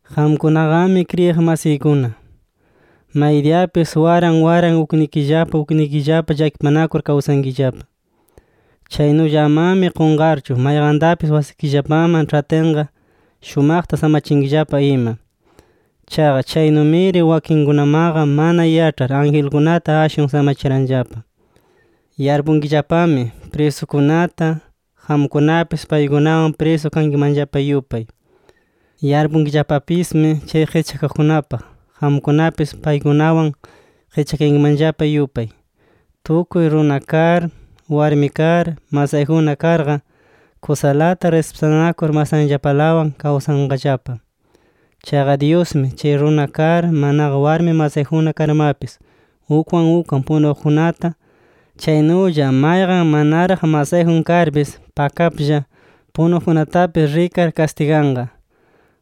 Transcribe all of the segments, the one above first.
Qamkunaqami kriyiq masiykuna, maydiyapis waran waran uknikillapa uknikillapa llakipanakur kawsankillapa. Chaynulla amami qunqarchu, mayqantapis wasikillapaman ĉhatinqa, shumaqta samachinkillapa ima. Chaqa chaynumiri wakinkunamaqa mana yaĉhar, angelkunata ashwan samachiranllapa. Yarpunkillapami prisukunata, qamkunapis paykunawan prisu kankimanllapa yupay. Yarpunkillapapismi chay qischakaqkunapaq, qamkunapis paykunawan qischakayankimanllapa yupay. Tukuy runa kar, warmi kar, masayjunna karqa, kusalata rispitanakur masanllapalawan kawsanqallapa. Chaqa Dyusmi, chay runa kar, manaqa warmi masayjunna karmapis ukwan ukwan punuqkunata, chaynulla mayqan manaraq masayjun karpis pakaplla punuqkunatapis rikar kastiganqa.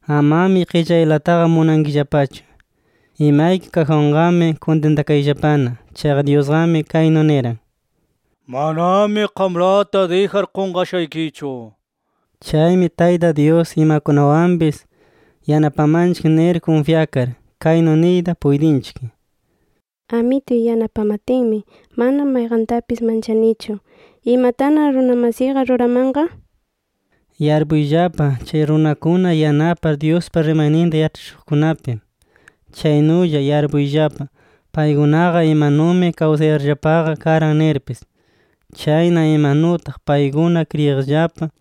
Amami qillaylataqa munankillapachu. Imayki kaqwanqami kuntintakayllapana. Chaqa Dyusqami kaynu niran: “Manami qamlata dijar qunqashaykichu” nir. Chaymi Tayta Dyus imakunawanpis yanapamanchik nir kunfyakar, kaynu niyta puytinchik: “Amituy yanapamatinmi, mana mayqantapis manchanichu. ¿Imatana runa masiyqa ruramanqa?” nir. Yarpuyllapa chay runakuna yanapar Dyuspa rimayninta yaĉhachishuqkunapi. Chaynulla yarpuyllapa paykunaqa imanumi kawsayarllapaqa karan nirpis. Chayna imanutaq paykuna kriyiqllapa,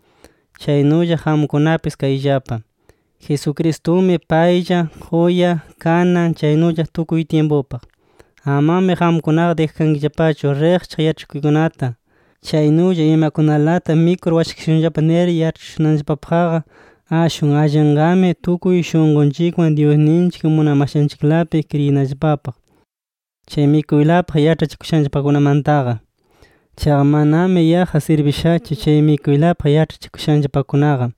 chaynulla qamkunapis kayllapa. Jesucristumi paylla, quya, kanan, chaynulla tukuy tyimpupaq. Amami qamkunaqa dijakankillapachu riqchaq yaĉhachikuykunata, chaynulla imakunalata mikur washakashunllapa nir yaĉhachishunanllapapaqqa. Ashwan allinqami tukuy shunqunchikwan Dyusninchik munamashanchiklapi kriyinallapapaq, chay mikuylapaq yaĉhachikushanllapakunamantaqa. Chaqa manami yaqqa sirbishachu chay mikuylapaq yaĉhachikushanllapakunaqa.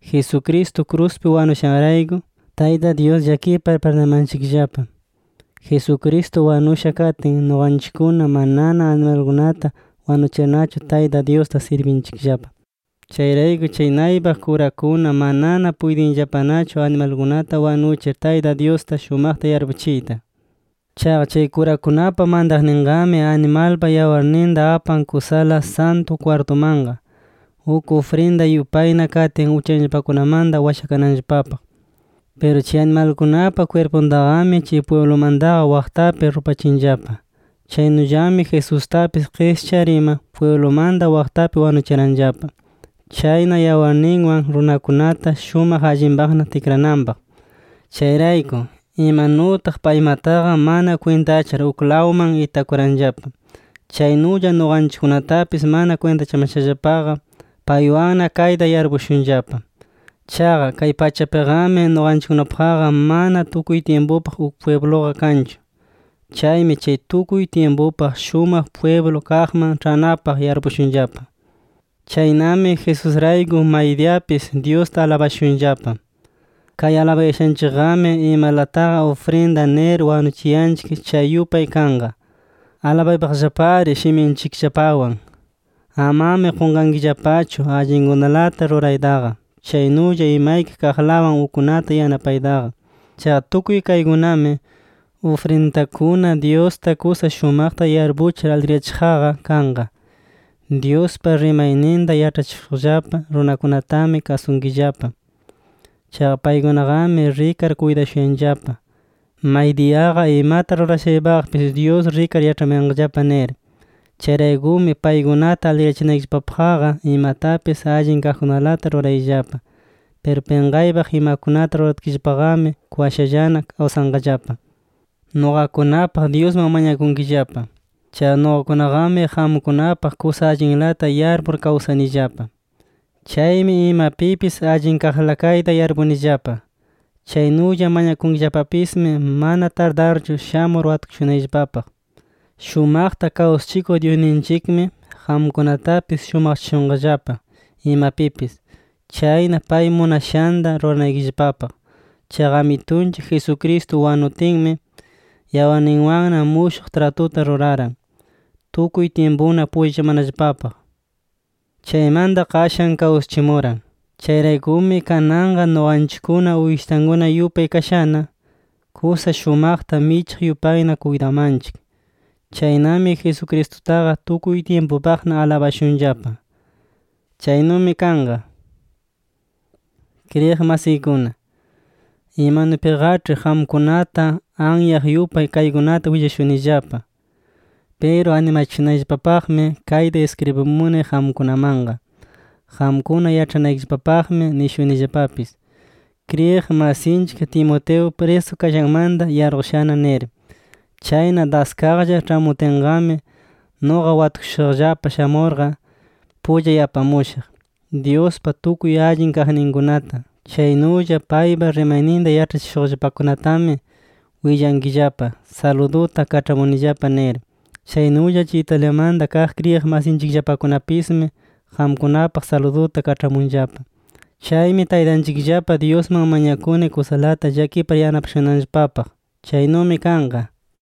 Jesucristo kruspi wanushanrayku, Tayta Dyus llakipar pirdunamanchikllapa. Jesucristo wanusha katin nuqanchikkuna manana animalkunata wanuchirnachu, Tayta Dyusta sirbinchikllapa. Chayrayku chay naypaq kurakuna manana puytinllapanachu animalkunata wanuchir Tayta Dyusta shumaqta yarpuchiyta. Chaqa chay kurakunapa mantaqninqami animalpa yawarninta apan kusala Santu kwartumanqa, uk ufrinda yupayna katin uchanllapakunamanta washakananllapapaq. Piru chay animalkunapa kwirpuntaqami, chay pwiblumantaqa waqtapi rupachinllapa. Chaynullami Jesustapis qischar ima, pwiblumanta waqtapi wanuchiranllapa. Chayna yawarninwan runakunata shumaq allinpaqna tikrananpaq. Chayrayku, imanutaq paymataqa mana kwintachar uklawman itakuranllapa, chaynulla nuqanchikkunatapis mana kwintachamashallapaqa, paywanna kayta yarpushunllapa. Chaqa kay pachapiqami, nuqanchikkunapaqqa mana tukuy tyimpupaq uk pwibluqa kanchu. Chaymi chay tukuy tyimpupaq shumaq pwiblu kaqman ĉhanapaq yarpushunllapa. Chaynami Jesusrayku maydiyapis Dyusta alabashunllapa. Kay alabayashanchikqami, imalataqa ufrinda nir wanuchiyanchik chay yupay kanqa. ¡Alabaypaqllapari shiminchikllapawan! Amami qunqankillapachu allinkunalata ruraytaqa, chaynulla imayki kaqlawan ukkunata yanapaytaqa. Chaqa tukuy kaykunami, ufrinditakuna Dyusta kusa shumaqta yarpuchir aligriyachiqqa kanqa. Dyuspa rimayninta yaĉhachishuqllapa runakunatami kasunkillapa. Chaqa paykunaqami rikar kuytashuyanllapa, maydiyaqa imata rurashaypaqpis Dyus rikar yaĉhamayanqallapa nir. Chayraykumi paykunata aligriyachinaykillapapaqqa, imatapis allin kaqkunalata rurayllapa. Piru pinqaypaq imakunata ruratkillapaqami, kwashallana kawsanqallapa. Nuqakunapaq Dyusman mañakunkillapa. Chaqa nuqakunaqami qamkunapaq kusa allinlata yarpur kawsanillapa. Chaymi imapipis allinkaqla kayta yarpunillapa. Chaynulla mañakunkillapapismi, mana tardarchu shamur watukushunayllapapaq. Shumaqta kawsachikuq Dyusninchikmi, qamkunatapis shumaqchashunqallapa imapipis. Chayna pay munashanta ruranaykillapapaq. Chaqa Amitunchik Jesucristo wanutinmi, yawarninwanna mushuq tratuta ruraran, tukuy tyimpuna pullachamanallapapaq. Chaymanta qashan kawsachimuran. Chayraykumi kananqa nuqanchikkuna uyshitankuna yupay kashana, kusa shumaqta michiq yupayna kuytamanchik. Chaynami Jesucristutaqa, tukuy tyimpupaqna alabashunllapa. ¡Chaynumi kanqa! Kriyiq masiykuna, imanupiqaĉhi qamkunata anyaq yupay kaykunata willashunillapa. Piru animachishunayllapapaqmi kayta iskribimuni qamkunamanqa. Qamkuna yaĉhanaykillapapaqmi nishunillapapis, kriyiq masinchik Timoteo prisu kashanmanta yarqushana nir. Chayna daskaqlla ĉhamutinqami, nuqa watukushuqllapa shamurqa, pullay apamushaq. Dyuspa tukuy allin kaqninkunata, chaynulla paypa rimayninta yaĉhachishuqllapakunatami, willankillapa saluduta kaĉhamunillapa nir. Chaynulla chay Italiamanta kaq kriyiq masinchikllapakunapismi, qamkunapaq saluduta kaĉhamunllapa. Chaymi Taytanchikllapa Dyusman mañakuni kusalata llakipar yanapashunanllapapaq. Chaynumi kanqa.